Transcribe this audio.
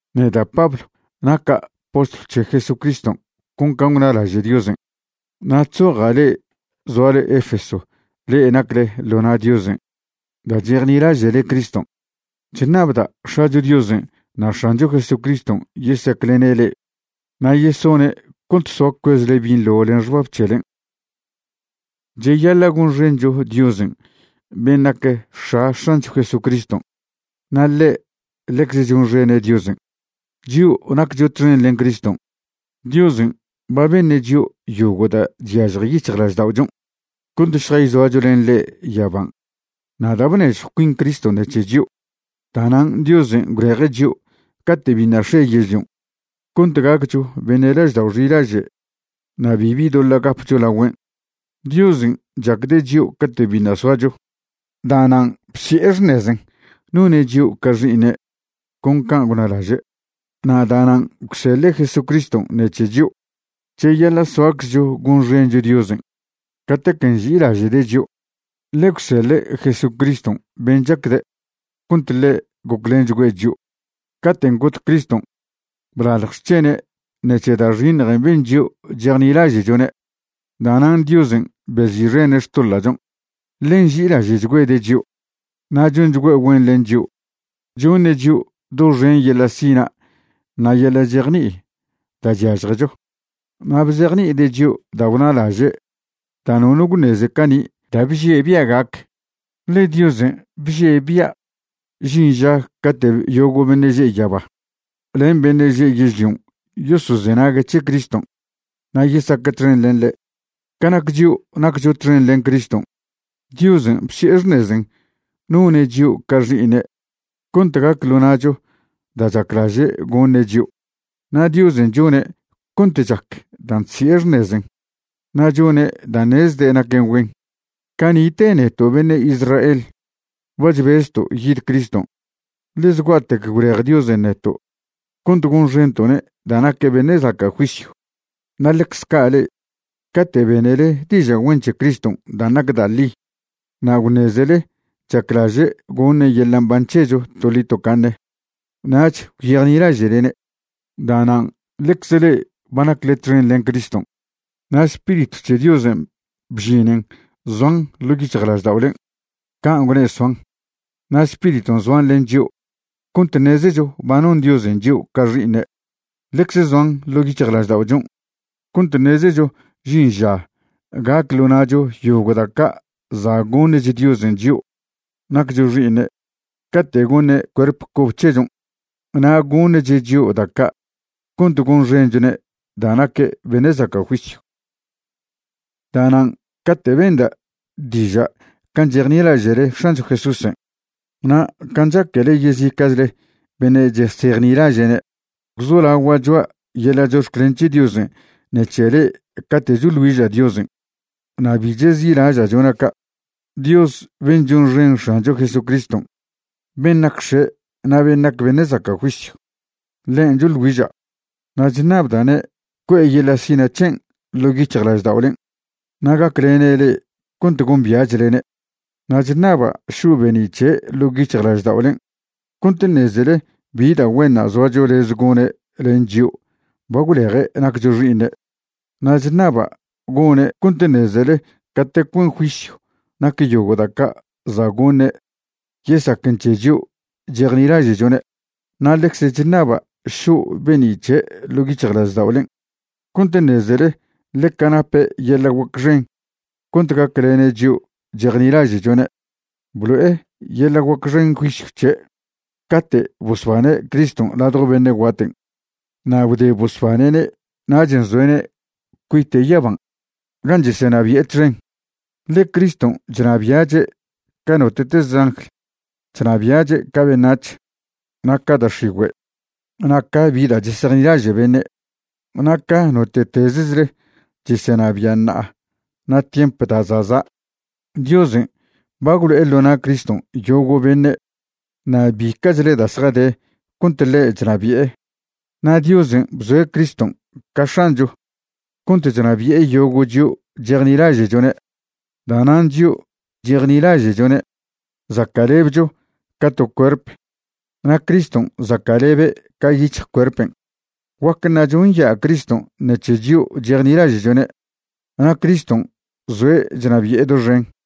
Neda' Pablo naca' postlw c̱he Jesucriston' con can' gwnalaže' Diosen'. Na' chzoja' le'e zoale Efeso le'e nacle ḻo na' Diosen' da' chejnilaže'le Criston'. Chṉabda' X̱acho Diosen' na' X̱ancho Jesucriston' yesaclene' le'e na' yesone' cont soa cuezle binḻo len xbab c̱helen'. Cheyaḻa' gonxencho Diosen' ben' nac X̱a X̱ancho Jesucriston' na' ḻe' ḻecze chonxene' Diosen'. Chio' naccho txen len Criston', Diosen' ba beṉe' chio' yogo' da' chyažje yic̱hjlažda'ochon' cont šjayzoacho len ḻe' yaban'. Na' da' bnežjw cuin Criston' ṉec̱he chio', da'nan' Diosen' gwleje' chio' cate' biṉa' x̱e yežlion' cont gaccho beṉe' laždao' xilaže' na' bibi doḻa' gapcho lagüen'. Diosen' chacde' chio' cate' biṉa' soacho. Da'nan' bsi'e xṉezen' none' chio' ca xi'iṉe' con can' gwnalaže', na' da'nan' gwseḻe' Jesucriston' ṉec̱he chio'. Cheyaḻa' soaczcho gonxencho Diosen' catec nži'ilaže'de' chio', ḻe gwseḻe' Jesucriston' ben' chacde' cont ḻe' goclenchgüe' chio'. Caten' got Criston', blalj xc̱hene' ṉec̱he da' xiṉjen' ben chio' chejnilaže'chone'. Da'nan' Diosen' bezi'xene' xtoḻa'chon', ḻe nži'ilaže'chgüede' chio'. Na' chonchgüe' güen len chio', choṉe' chio' doxen yeḻa' sina' na' yeḻa' chejni'i da' chyažjecho. Na' bzejni'ide' chio' da' gwnalaže' da' nono gwṉeze cani' da' bžie' bia' gac. Ḻe Diosen' bžie' bia' žin ža cate' yogo' beṉe' že' yaba len beṉe' že' yežlion' yosozenague' c̱he Criston' na' yesaque' txen len ḻe'. Ca nac chio' naccho txen len Criston', Diosen' bsi'e xṉezen' none' chio' ca xi'iṉe' cont gac ḻo na'cho da' chaclaže' goṉe' chio'. Na' Diosen' chone' cont chac dan' chsi'e xṉezen' na' chone' da' ṉezde' naquen güen. Cani'te neto' beṉe' Israel ba chbezto' yid Criston', ḻe zgua'tec gwlej Diosen' neto' cont gonxento'ne' da' naque' beṉe' zaca' juisyw. Na' ḻecze ca' le'e, cate' benele diža' güen c̱he Criston' dan' nac da' ḻi na' gwṉezele chaclaže' goṉe' yeḻa' mban c̱hecho toḻi tocaṉe, nach gwyejnilaže'lene'. Da'nan' ḻecze le'e ba nacle txen len Criston', na' Spiritw c̱he Diosen' bžinen zoan ḻo' yic̱hjlažda'olen', can' gwne' soan. Na' Spiriton' zoan len chio' cont ṉezecho ba non Diosen' chio' ca xi'iṉe'. Ḻecze zoan ḻo' yic̱hjlažda'ochon' cont ṉezecho žin ža gac ḻo na'cho yogo' da' ca' za' goṉch Diosen' chio' naccho xi'iṉe' cate' goṉe' cuerp cobe c̱hechon'. Na' goṉche' chio' da' ca' cont gonxenchone' da' naque' beṉe' zaca' juisyw. Da'nan' cate' benda' diža' can' chejnilaže'le X̱ancho Jesúsen' na' can' chaquele yezica'chle beṉe' chesejnilaže'ne', gwzolagua' choa' yeḻa' chox̱clen c̱he Diosen' ṉec̱he le'e cate' choḻ güiža' Diosen', na' bi chezi'laža' chona' ca'. Dios ben' chonxen X̱ancho Jesucriston', ben' nac X̱e' na' ben' nac beṉe' zaca' juisyw, ḻen' choḻ güiža'. Na' chṉabda'ne' cue' yeḻa' sina' c̱hen' ḻo' yic̱hjlažda'olen' na' gaclene' le'e cont gombia'chlene'. Na' chṉaba' šo' be'ni' c̱he' ḻo' yic̱hjlažda'olen' cont ṉezele bi da' güenṉa' zoacho lez gone' len chion' ba gwleje' naccho xi'iṉe'. Na' chṉaba' gone' cont ṉezele catec güen juisyw nac yogo' da' ca' za' goṉe' yesaquen c̱he chio' chejnilaže'chone'. Na' ḻecze chṉaba' šo' be'ni' c̱he' ḻo' yic̱hjlažda'olen' cont ṉezele ḻeca nape' yeḻa' guac xen cont gaclene' chio' chejnilaže'chone'. Blo'e yeḻa' guac xen juisyw c̱he' cate' bosbane' Criston' ladjo beṉe' guaten'. Na' gwde bosbane'ne' nach nzoe'ne' cuite' yaban' gan' chesenabi'e txen. Ḻe Criston' chnabia'che' ca note'teze angl. Chnabia'che' ca beṉac̱h, na' ca da' x̱igüe', na' ca bi da' chesejnilaže' beṉe', na' ca note'tezechle chesenabia' ṉa'a na' tiemp da' za' za'. Diosen' ba gwlo'e ḻo na' Criston' yogo' beṉe' na' bica'chle da' zjade cont ḻe' chnabi'e. Na' Diosen' bzoe' Criston' ca X̱ancho cont chnabi'e yogo' chio' chejnilaže'chone'. Da'nan' chio' chejnilaže'chone' zaca'lebcho ca to cuerp, na' Criston' zaca'lebe' ca yic̱hj cuerpen'. Guac ṉacho nya' Criston' ṉec̱he chio' chejnilaže'chone'. Na' Criston' zoe' chnabi'e doxen.